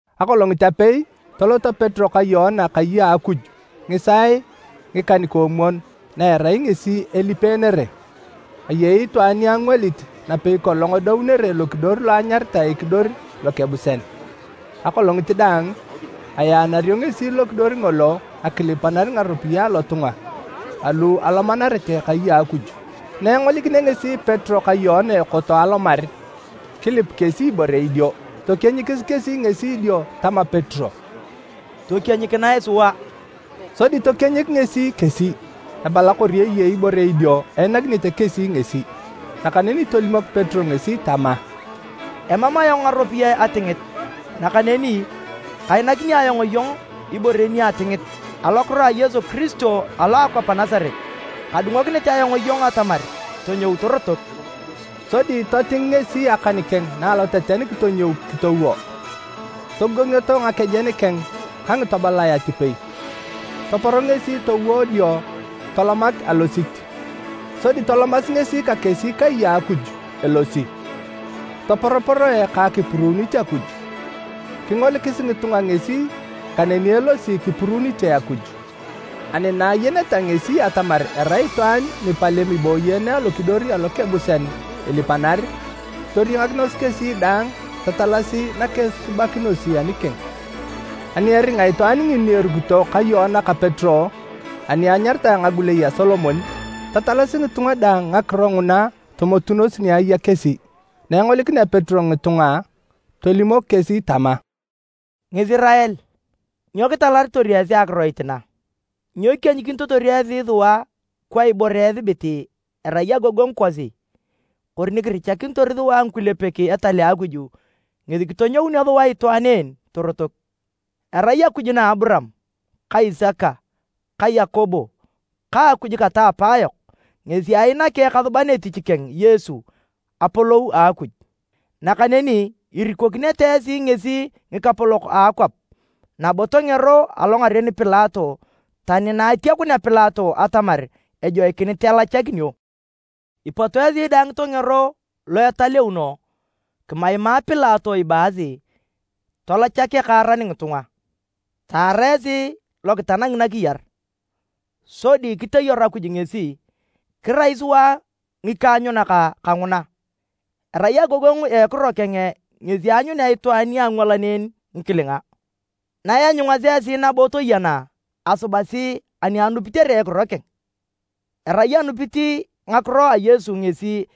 Akolongit apei, toloto Petero ka Yoana kai a Akuj ngisaae ngikan-koomwon na erai ngesi elipenere. Ayei itwaan ni angwalit napei kolong edounere lokidor lo anyaritae Ekidor Lokebusean. Akolongit daang ayaanario ngesi lokidor ngolo akilipanar ngaropiyae alotunga alu alomanarete kai a Akuj. Na engolikinea ngesi Petero ka Yoana ekoto alomar, kilip kesi ibore idio. Tokienyikis kesi ngesi dio tama Petero, “Tokienyikinae sua!” Sodi tokienyik ngesi kesi, ebala kori eyei ibore idio einakinete kesi ngesi. Nakaneni tolimok Petero ngesi tama, “Emam ayong ngaropiyae atingit, nakaneni kainakini ayong iyong ibore ni atingit, alokiro a Yesu Kiristo alo a akwap a Nasaret, kadungokinit ayong iyong atamar tonyou torotok!” Sodi toting ngesi akan keng na aloteten kitonyou kitowo. Togogongioto ngakejen keng ka ngitobolae atipei, topor ngesi towo dio tolomak alosit. Sodi tolomasi ngesi ka kesi kai a Akuj elosi, toporoporoe ka akipuruunit Akuj. Kingolikis ngitunga ngesi kaneni elosi kipuruunite Akuj, ani na ayeneta ngesi atamar erai itwaan ni palem iboyeene Alokidor Alokebusian ilipanar, toriangakinos kesi daang tatalasi nakesubakinosi anikeng. Ani eringa itwaan ngini erukito ka Yoana ka Petero ani anyaritae ngagulei a Solomon, tatalasi ngitunga daang ngakiro nguna tomotunos ni aya kesi. Na engolikinea Petero ngitunga, tolimok kesi tama, “Ngisirael, nyo kitalaritor esi akiroit na? Nyo kikienyikinitotor esi sua kwa ibore esibit erai agogongu kosi, kori ni kirichakinitor sua ngikulepek etal a Akuj ngesi kitonyounio sua itwaan en torotok! Erai Akuj na Aburaam ka Isaka ka Yakobo ka Akuj kata apaayok ngesi ainaki Ekasuban etich keng Yesu apolou a Akuj. Nakaneni irikokinete esi ngesi ngikapolok a akwap nabo tongero alongaren Pilato tani na atiakunea Pilato atamar ajoikinit elachakinio. Ipot esi tongero lo italeuno, kimaimaa Pilato ibaasi talachak ekaaran ngitunga. Taara esi lokitanangi nakiyar, sodi kiteyaru Akuj ngesi, kirai sua ngikaanyunak kanguna. Erai agogongu a ekiro keng ngesi aanyunea itwaan niangwalan en ngikilinga. Na ianyungasi esi nabo toyena, asubasi ani anupitere ekiro keng. Erai anupit ngakiro a Yesu ngesi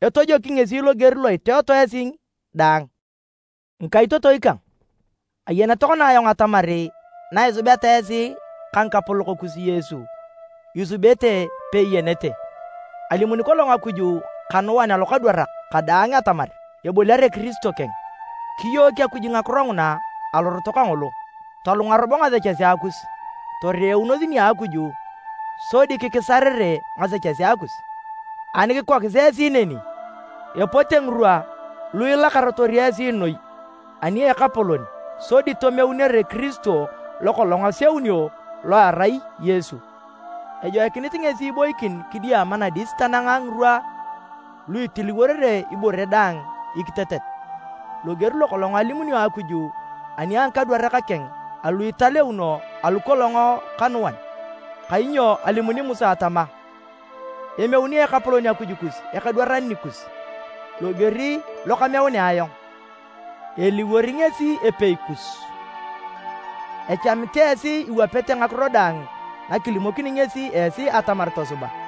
etojoki ngesi loger lo iteeto esi daang. “Ngikaitotoi kang, ayeni tokona ayong atamar na isubeta esi ka ngikapolok kus Yesu, isubete peiyenete. Alimuni kolong Akuj kanuan alokadwarak kadaang atamar eboliare Kiristo keng. Kiyook Akuj ngakiro nguna alorot kangolo. Tolunga robo ngasechesea kus toreunos nia Akuj sodi kikisarere ngasechesea kus. Ani kikokis esi neni, epote ngirwa lu ilakarator esi noi ani a Ekapolon sodi tomeunere Kiristo lokolong aseunio lo erai Yesu. Ejoikinit ngesi iboikin kidiama nadis tanang ngirwa lu itiliworere ibore daang ikitetet, loger lokolong alimunio Akuj ani a ngikadwarak keng alu italeuno alu kolong kanuan. Kainyo alimuni Musa tama, ‘Emeuni Ekapolon Akuj kus ekadwaran nikus loger lo kameunea ayong, eliwor ngesi epei kus. Echamit esi iwapete ngakiro daang na kilimokini ngesi esi atamar tosuba.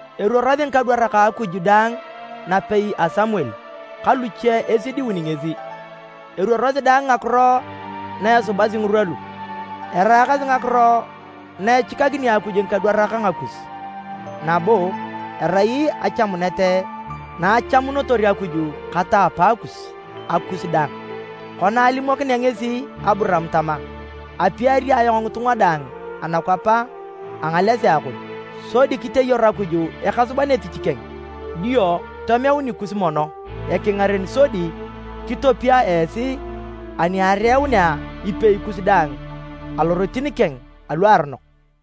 Eruorosi ngikadwarak a Akuj daang napei a Samuel ka luche esidiun ngesi, eruorosi daang ngakiro na esubasi ngirwa lu. Eraakasi ngakiro na echikakini Akuj ngikadwarak ngakus, nabo erai achamunet na achamunotor Akuj kata apaakus, akus dang. Kona alimokinea ngesi Aburaam tama, ‘Apiari ayong ngitunga daang anakwap a ngalesea kon.’ Sodi kiteyaru Akuj Ekasuban etich keng dio tomeu nikus mono ekingaren sodi kitopia esi ani ereunea ipei kus daang alorotin keng aluaronok.”